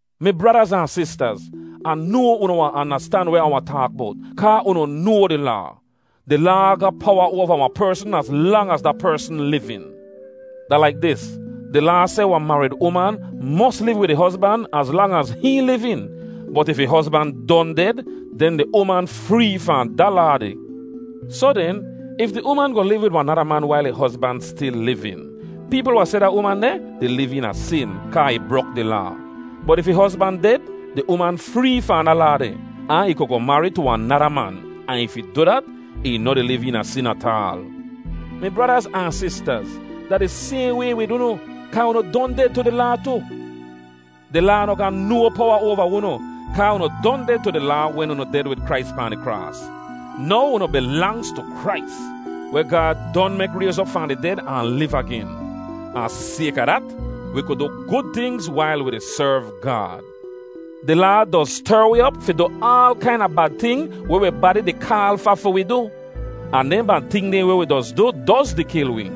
Mi bradaz ahn sistaz, Ah noa unu wahn andastan weh Ah wahn taak bowt, kaa unu noa di Laa. Di Laa ga powa oava wahn persn az lang az da persn livin. Da laik dis: Di Laa seh wahn marid uman mos liv wid ih hozban az lang az hihn livin, bot if ih hozban don ded, den di uman free fahn da laa deh. Soh den, if di uman goh liv wid wahn nada man wail ih hozban stil livin, peepl wahn seh da uman deh di liv eena sin, kaa ih brok di Laa. Bot if ih hozban ded, di uman free fahn da laa deh, ahn ih ku goh marid tu wahn nada man, ahn if ih du dat, ih noh di liv eena sin ataal. Mi bradaz ahn sistaz, da di sayhn way wid unu, kaa unu don ded tu di Laa tu. Di Laa noh ga no powa oava unu, kaa unu don ded tu di Laa wen unu ded wid Krais pahn di kraas. Now unu bilangz tu Krais, weh Gaad don mek rayz op fahn di ded ahn liv agen. Ahn sayka dat, wi ku du gud tingz wail wi di serv Gaad. Di Laa doz ster wi op fi du aal kaina bad ting weh wi badi di kaal fa fi wi du; ahn dehn bad ting dehn weh wi doz du doz di kil wi.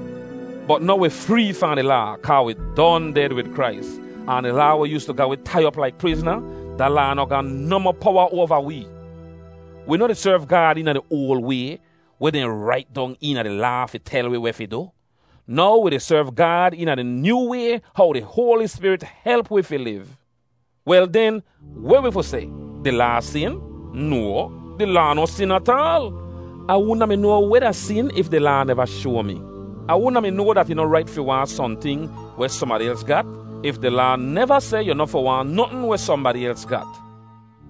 Bot now wi free fahn di Laa, kaa wi don ded wid Krais. Ahn di Laa weh yoostu ga wi tai op laik prizna, da Laa noh ga nohmoh powa oava wee. Wi noh di serv Gaad eena di oal way, weh dehn rait dong eena di Laa fi tel wi weh fi du. Now wi di serv Gaad eena di nyoo way how di Hoali Spirit help wi fi liv. Wel den, weh wi fi seh? Di Laa sin? No, di Laa no sin ataal. Ah wudn a mi noa weh da sin if di Laa neva shoa mi. Ah wudn a mi noa dat ih noh rait fi waahn sohnting weh sohnbadi els gat if di Laa neva seh yu noh fi waahn notn weh sohnbadi els gat.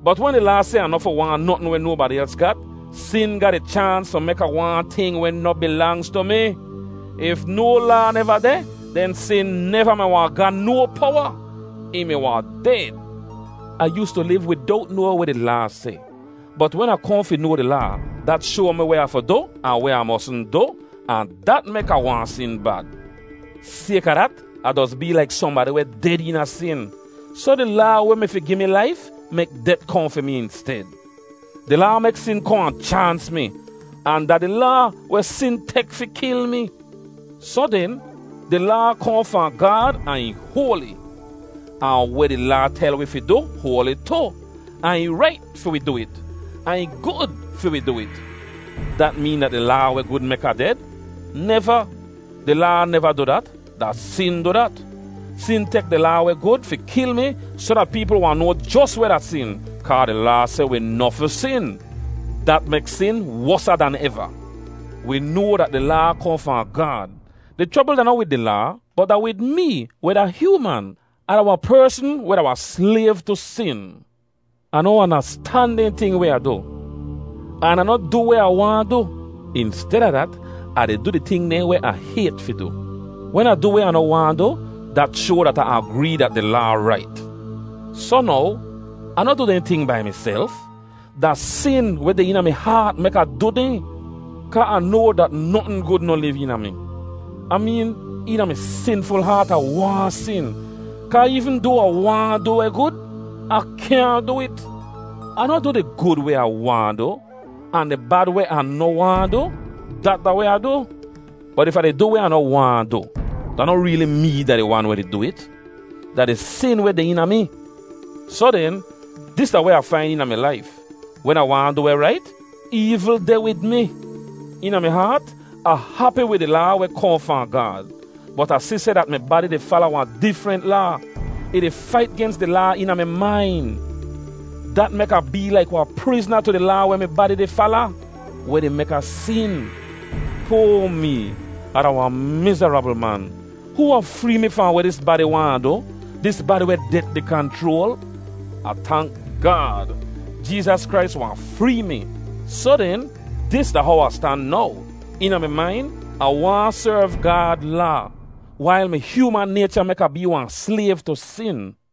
Bot wen di Laa seh Ah noh fi waahn notn weh nobadi els gat, sin ga di chaans fi mek Ah waahn ting weh noh bilangz tu mi. If no Laa neva deh, den sin neva mi wahn ga no powa; ih mi wahn ded. Ah yoostu liv widowt noa weh di Laa seh. Bot wen Ah kohn fi noa di Laa, dat shoa mi weh Ah fi du, ahn weh Ah mosn du, ahn dat mek Ah waahn sin bad. Sayka dat, Ah doz bee laik sohnbadi weh ded eena sin. Soh di Laa weh mi fi gi mi laif mek det kohn fi mi insted. Di Laa mek sin kohn ahn chaans mi, ahn da di Laa weh sin tek fi kil mi. Soh den, di Laa kohn fahn Gaad ahn ih hoali. Ahn weh di Laa tel wi fi du hoali tu, ahn ih rait fi wi du it, ahn ih gud fi wi du it. Dat meen dat di Laa weh gud mek Ah ded? Neva! Di Laa neva du dat; da sin du dat. Sin tek di Laa weh gud fi kil mi soh dat peepl wahn noa jos weh da sin, kaa di Laa seh wi noh fi sin. Dat mek sin wosa dan eva. Wi noa dat di Laa kohn fahn Gaad. Di chrobl da noh wid di Laa, bot da wid mee, weh da hyooman. Ah da wahn persn weh da wahn slayv tu sin. Ah noh andastan dehn ting weh Ah du, an Ah noh du weh Ah waahn du. Insteda dat, Ah di du di ting dehn weh Ah hayt fi du. Wen Ah du weh Ah noh waahn du, dat shoa dat Ah agree dat di Laa rait. Soh now, Ah noh du dehn ting bai miself. Da sin weh deh eena mi haat mek Ah du dehn. Kaa Ah noa dat notn gud noh liv eena mi. Ah meen, eena mi sinful haat Ah waahn sin, kaa eevn doa Ah waahn du weh gud, Ah kyaahn du it. Ah noh du di gud weh Ah waahn du, ahn di bad weh Ah noh waahn du, dat da weh Ah du. Bot if Ah di du weh Ah noh waahn du, da noh reeli mee da di wan weh du it. Da di sin weh deh eena mi. Soh den, dis da weh Ah fain eena mi laif: Wen Ah waahn du rait, eevl deh wid mi. Eena mi haat Ah hapi wid di Laa weh kohn fahn Gaad. Bot Ah si seh dat mi badi di fala wahn difrent laa; ih di fait gens di laa eena mi main. Dat mek Ah bee laik wahn prizna tu di laa weh mi badi di fala, weh di mek Ah sin. Poa mee! Ah da wahn mizarabl man! Hoo wahn free mi fahn weh dis badi waahn Ah du, dis badi weh det di kanchroal? Ah tank Gaad! Jeezas Krais wahn free mi. Soh den, dis da how Ah stan now: Eena mi main, Ah waahn serv Gaad Laa, wail mi hyooman naycha mek Ah bee wahn slayv tu sin.